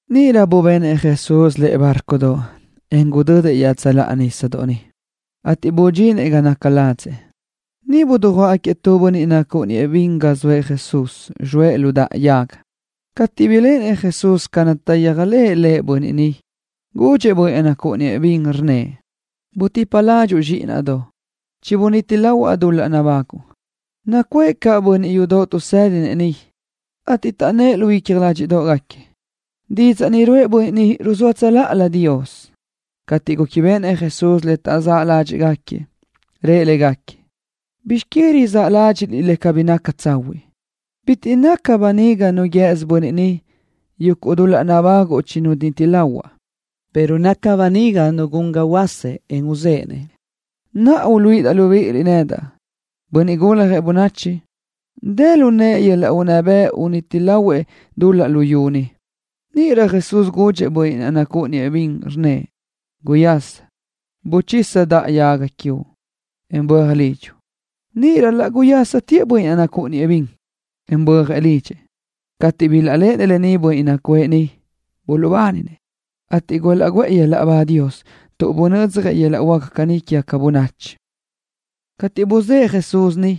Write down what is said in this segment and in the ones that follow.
Níʼirö bubenëʼ Jesús lëʼe bárcodoʼ, en gudödëʼ iaʼtsöláʼa nísadoʼ niʼ, ateʼ budxinëʼ ga naca ladzëʼ. Niʼ dujuáʼgaquiëʼ tu bönniʼ nacúʼuniëʼ bin ga zoëʼ Jesús, zxoëʼ lu daʼa yaga. Cateʼ biléʼenëʼ Jesús ca naʼ taʼyéajlëʼë bönniʼ ni Lëʼ, gudxëʼ bönniʼ naʼ nacúʼuniëʼ bin, rnnëʼ: —Butipa ládxuʼu, zxíʼinaʼdoʼ. Chibuníti lahuaʼ dul-laʼ nabáguʼu. Nacuʼë caʼ bönniʼ yudoʼ tuʼsédinëʼ niʼ, ateʼ taʼnnë́ʼ lu icja ládxiʼdoʼgaquiëʼ, taʼnnë́ʼ: “Didzaʼ ruʼë bönniʼ ni ruzóa Dios tsöláʼalö.” Cateʼ réquibeʼenëʼ Jesús le taʼzáʼ ládxiʼgaquiëʼ, rëʼ légaquiëʼ: —¿Bizx que rizáʼ ládxiʼliʼ caní le cabí naca tsahuiʼ? Bitiʼ naca böniga nu guië́sö bönniʼ ni: “Yuguʼ dul-laʼ nabáguʼu chibuníti lahuaʼ”, pero naca böniga nu gun ga huöásëʼ, en uzéʼenëʼ. Naʼa, uluíʼidaʼ libíʼiliʼ nedaʼ, Bönniʼ Guljëʼ Bönachi, dë lu naʼa yöl-laʼ unná bëʼ uniti lahuaʼ dul-laʼ luyú ni. Níʼirö Jesús gudxëʼ bönniʼ naʼ nacúʼuniëʼ bin, rnnëʼ: —Guyása. Buchisa daʼa yaga quiuʼ, en böaj lidxuʼ. Níʼirö laʼ guyásatëʼ bönniʼ naʼ nacúʼuniëʼ bin, en bö́ajëʼ lidxëʼ. Cateʼ bilaʼléʼenëʼ bönniʼ nacuʼë niʼ lë ni, buluʼbáninëʼ, ateʼ gulaʼguʼë Dios yöl-laʼ ba tuʼ bunödzjëʼ yöl-laʼ huáca caní quégaca bönachi. Cateʼ buzë́ʼë Jesús niʼ,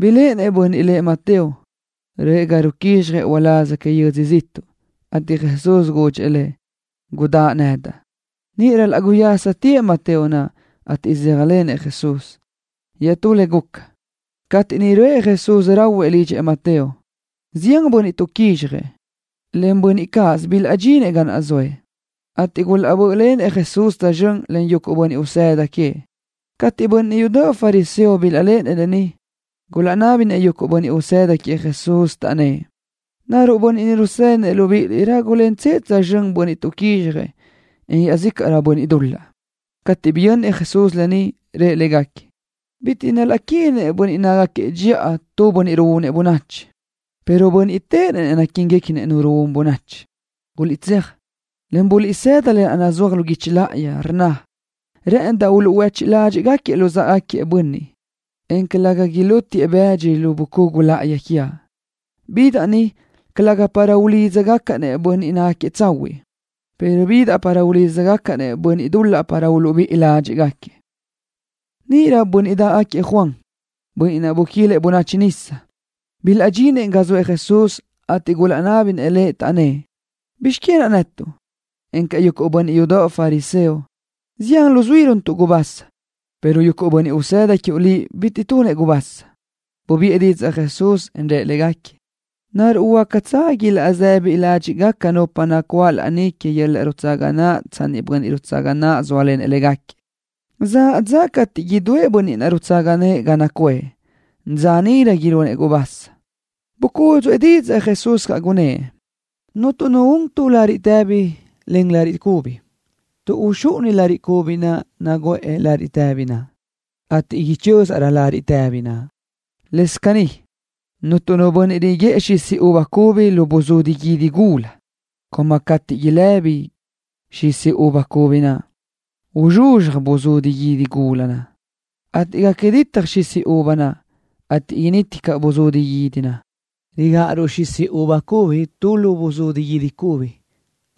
biléʼenëʼ bönniʼ lëʼ Mateo, röʼë ga naʼ ruquízxjëʼ uláz que yödzö ziʼtuʼ, ateʼ Jesús gudxëʼ lëʼ: —Gudáʼ nedaʼ. Níʼirö laʼ guyásatëʼ Mateo naʼ, ateʼ saʼyéajlenëʼ Jesús. Iaʼtú le guca, cateʼ niʼ röʼë Jesús rahuëʼ ga naca lidxëʼ Mateo, zián bönniʼ tuʼquízxjëʼ, en yuguʼ bönniʼ cáʼasö bilaʼdxinëʼ ga zoëʼ, ateʼ gulaʼbö́ʼlenëʼ Jesús tsözxö́n len yuguʼ bönniʼ usëda queëʼ. Cateʼ bönniʼ yudoʼ fariseo bilaʼléʼenëʼ lë ni, gulaʼnábinëʼ yuguʼ bönniʼ usëda queëʼ Jesús, taʼnnë́ʼ: —¿Naruʼ bönniʼ rusédinëʼ libíʼiliʼ rágulentsëʼ tsözxö́n bönniʼ tuʼquízxjëʼ, en iáʼzícaʼrëʼ bönniʼ dul-laʼ? Cateʼ biyönnëʼ Jesús lë ni, rëʼ légaquiëʼ: —Bitiʼ naquíniguequinëʼ bönniʼ nácagaquiëʼ dxiʼa nu un bönachi, pero bönniʼ téʼenëʼ naquíniguequinëʼ nu un bönachi. Guliʼtséaj, en buliʼsëda le rnna lë naʼ nazúaj lu guichi láʼayi, le rnna caní: “Rë́ʼëndaʼ uluʼhuéchiʼ ládxiʼgaquiëʼ bönniʼ luzáʼagaquiëʼ, en calëga ilútiëʼ-baʼ böaʼ bëdxi lu bucugu láʼayi quiaʼ.” Bidaʼ ni, calëga para ulídzagacaʼ-nëʼ bönniʼ tsahuiʼ, pero bidaʼ para ulídzagacaʼ-nëʼ bönniʼ dul-laʼ para uluʼbíʼi ládxiʼgaquiëʼ. Níʼirö bönniʼ dáʼgaquiëʼ Juan, bönniʼ naʼ buquilëʼ bönachi nisa, bilaʼdxinëʼ ga zoëʼ Jesús, ateʼ gulaʼnábinëʼ Lëʼ, taʼnnë́ʼ: —¿Bizx que naʼ netuʼ, encaʼ yuguʼ bönniʼ yudoʼ fariseo, zián luzuí runtuʼ gubasa, pero yuguʼ bönniʼ usëda quiuʼ Liʼ bitiʼ tunëʼ gubasa? Bubiʼë didzaʼ Jesús, en rëʼ légaquiëʼ: —¿Naruʼ huácatsö ilaʼsëbi ládxiʼgaca nupa nacuáʼ laní que yöl-laʼ rutsaga naʼ tsanni niʼ bönniʼ rutsaga nëʼë zóalenëʼ légaquiëʼ? Zaʼ dza cateʼ idúëʼ bönniʼ naʼ rutsaga nëʼë ga nacuʼë. Dza níʼirö ilunëʼ gubasa. Bucúdzuʼë didzaʼ Jesús, rnnëʼ: —Cuntu nu un tu lariʼ tëbi len lariʼ cubi, tuʼ uxúʼuni lariʼ cubi naʼ nuguʼë lariʼ tëbi naʼ, ateʼ ichö́zaʼrö lariʼ tëbi naʼ. Lëscaʼ caní, cuntu nu bönniʼ riguë́ʼënëʼ xisi uva cubi tu lu buzudi guídi gula, tuʼ galaj ilëbi xisi uva cubi naʼ, en uzxuzxaj buzudi guídi gula naʼ, ateʼ gaca ditaj xisi uva naʼ, ateʼ initi caʼ buzudi guídi naʼ. Rigáʼaruʼ xisi uva cubi tu lu buzudi guídi cubi,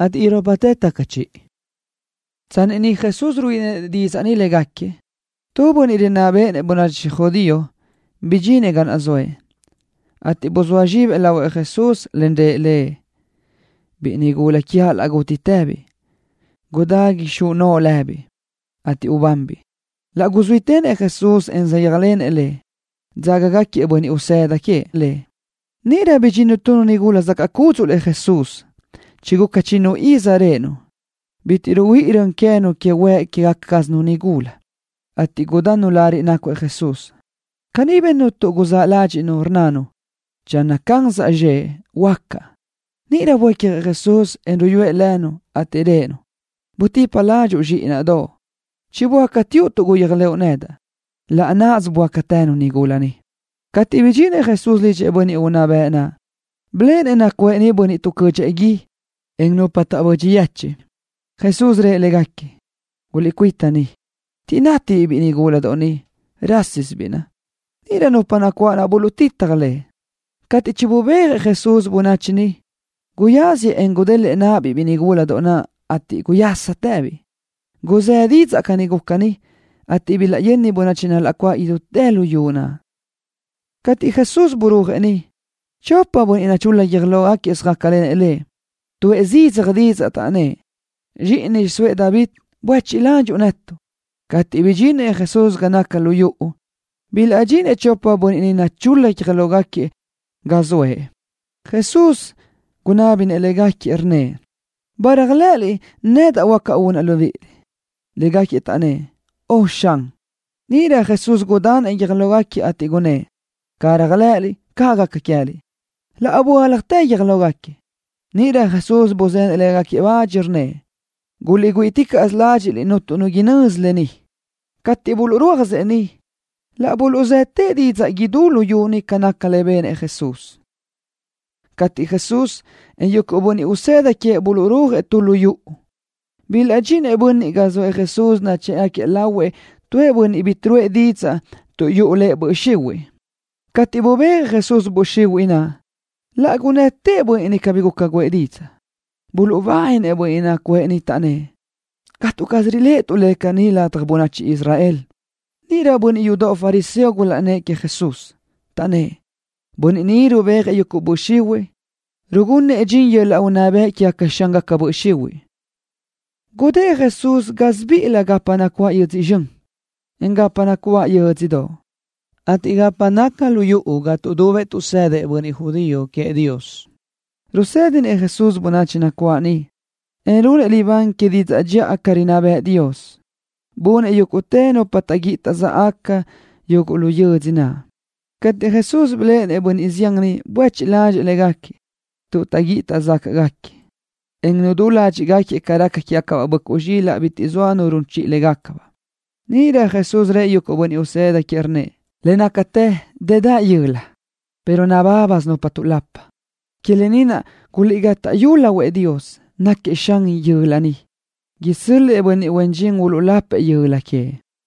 ateʼ irópatë taca chiʼi. Tsanni niʼ Jesús ruíʼilenëʼ légaquiëʼ didzaʼ ni, tu bönniʼ rinná béʼenëʼ bönachi judío bidxinëʼ ga zoëʼ, ateʼ buzóa zxibëʼ lahuëʼ Jesús, en rëʼ Lëʼ: —Biʼi nigúladoʼ quiaʼ laʼ gútitëbiʼ. Gudá ixóa noʼo lëbiʼ, ateʼ ubanbiʼ. Laʼ guzuítenëʼ Jesús, en saʼyéajlenëʼ lëʼ. Dzágagaquiëʼ bönniʼ usëda queëʼ Lëʼ. Níʼirö bidxinnu tu nigula zacaʼ cúdzuʼlëʼ Jesús, chiguca chinnu iz réʼenu, bitiʼ ruhuíʼi rön queë́nu que huëʼ quégaca cázanu nigula, ateʼ gudannu lariʼ nácuëʼ Jesús. Caní bennu tuʼ rizáʼ ládxiʼnu, rnnanu: Channö cansaʼ zxëʼ, huöácaʼ. Níʼirö buécjëʼ Jesús, en ruyúëʼ lënu, ateʼ rëʼë-nu: —Butipa ládxuʼu, zxíʼinaʼdoʼ. Chiböácateuʼ tuʼ réajlëʼu nedaʼ. Laʼ náʼasö böácatënu. Cateʼ bidxinëʼ Jesús lidxëʼ bönniʼ unná bëʼ naʼ, biléʼenëʼ nacuʼë niʼ bönniʼ tuʼcödxëʼ gui, en nupa taʼbödxi yechiʼ. Jesús rëʼ légaquiëʼ: —Guliʼcuita ni, tuʼ cabí nátibiʼ biʼi nigúladoʼ ni. Rásisibiʼ naʼ. Níʼirö nupa nacuáʼ niʼ buluʼtitaj Lëʼ. Cateʼ chinubéajëʼ Jesús bönachi naʼ níʼilö, guyáziëʼ, en gudélëʼë náʼabiʼ biʼi nigula naʼ, ateʼ laʼ guyásatëbiʼ. Guzë́ didzaʼ ca guca lë ni, ateʼ bilaʼyöni bönachi nacuáʼ idútë luyú naʼ. Cateʼ Jesús burúajëʼ niʼ, chopëʼ bönniʼ nachul-la guiö́j lógaquiëʼ söjácalenëʼ Lëʼ. Tuʼë zidzaj didzaʼ, taʼnnë́ʼ: —Zxíʼini xiʼsóëʼ David, buéchiʼ ladxiʼ netuʼ. Cateʼ bidxinëʼ Jesús ga naca lu yuʼu, bilaʼdxinëʼ chopëʼ bönniʼ naʼ nachul-la guiö́j lógaquiëʼ ga zoëʼ. Jesús gunábinëʼ légaquiëʼ, rnnëʼ: —¿Ba réajlëʼëliʼ nedaʼ, huáca unaʼ libíʼiliʼ? Légaquiëʼ taʼnnë́ʼ: —Ön, Xan. Níʼirö Jesús gudanëʼ guiö́j lógaquiëʼ, ateʼ rnnëʼ: —Ca réajlëʼëliʼ, caʼ gaca queë́liʼ. Laʼ böáljatë guiö́j lógaquiëʼ. Níʼirö Jesús buzenëʼ bach légaquiëʼ, rnnëʼ: —Guliʼgüíʼiticaʼsö ládxiʼliʼ cuntu nu inözi lë ni. Cateʼ buluʼrúajëʼ niʼ, laʼ buluʼzëtëʼ didzaʼ idútë luyú niʼ ca naca lë naʼ benëʼ Jesús. Cateʼ Jesús, en yuguʼ bönniʼ usëda queëʼ buluʼrúajëʼ tu lu yuʼu, bilaʼdxinëʼ bönniʼ ga zoëʼ Jesús nachë́ʼgaquiëʼ lahuëʼ tu bönniʼ bitiʼ ruʼë didzaʼ, tuʼ yuʼu lëʼ böʼ xihuiʼ. Cateʼ bubéajëʼ Jesús böʼ xihuiʼ naʼ, laʼ gunnëtëʼ bönniʼ naʼ bitiʼ guca guʼë didzaʼ. Buluʼbáninëʼ bönniʼ nacuʼë niʼ, taʼnnë́ʼ: —Catu caz riléʼetuʼ le caní ladaj bönachi Israel. Níʼirö bönniʼ yudoʼ fariseo gulaʼnnë́ʼ queëʼ Jesús, taʼnnë́ʼ: —Bönniʼ ni rubéajëʼ yuguʼ böʼ xihuiʼ, rugunëʼ dxin yöl-laʼ unná bëʼ que xángaca böʼ xihuiʼ naʼ. Gudë́ʼ Jesús idú gásibiʼilö gapa nacuáʼ yödzö zxön, en gapa nacuáʼ yö́dzödoʼ, ateʼ gapa naca lu yuʼu ga tuʼdubëʼ tuʼsëdëʼ bönniʼ judío queëʼ Dios. Rusédinëʼ Jesús bönachi nacuáʼ niʼ, en runëʼ libán que didzaʼ dxiʼa ca rinná bëʼë Dios. Bunëʼ yúguʼtë nupa bi taʼguíʼi taʼzacaʼ yuguʼ lu yödzö naʼ. Cateʼ Jesús biléʼenëʼ bönniʼ zián niʼ, buéchiʼ ládxëʼë légaquiëʼ, tuʼ taʼguíʼi taʼzáquiëʼ, en nudú ládxiʼgaquiëʼ ca raca quégacabaʼ böʼcuʼ zxilaʼ bitiʼ zoa nu ruyú légacabaʼ. Níʼirö Jesús rëʼ yuguʼ bönniʼ usëda queëʼ, rnnëʼ: —Le nácatë dëdaʼ yöla, pero nabábasö nupa tuʼlapa. Que lë ni naʼ, guliʼgátaʼyu lahuëʼ Dios, náquiëʼ Xan yöla naʼ, inábiliʼ-nëʼ isö́l-lëʼë bönniʼ huen dxin uluʼlapëʼ yöla queëʼ.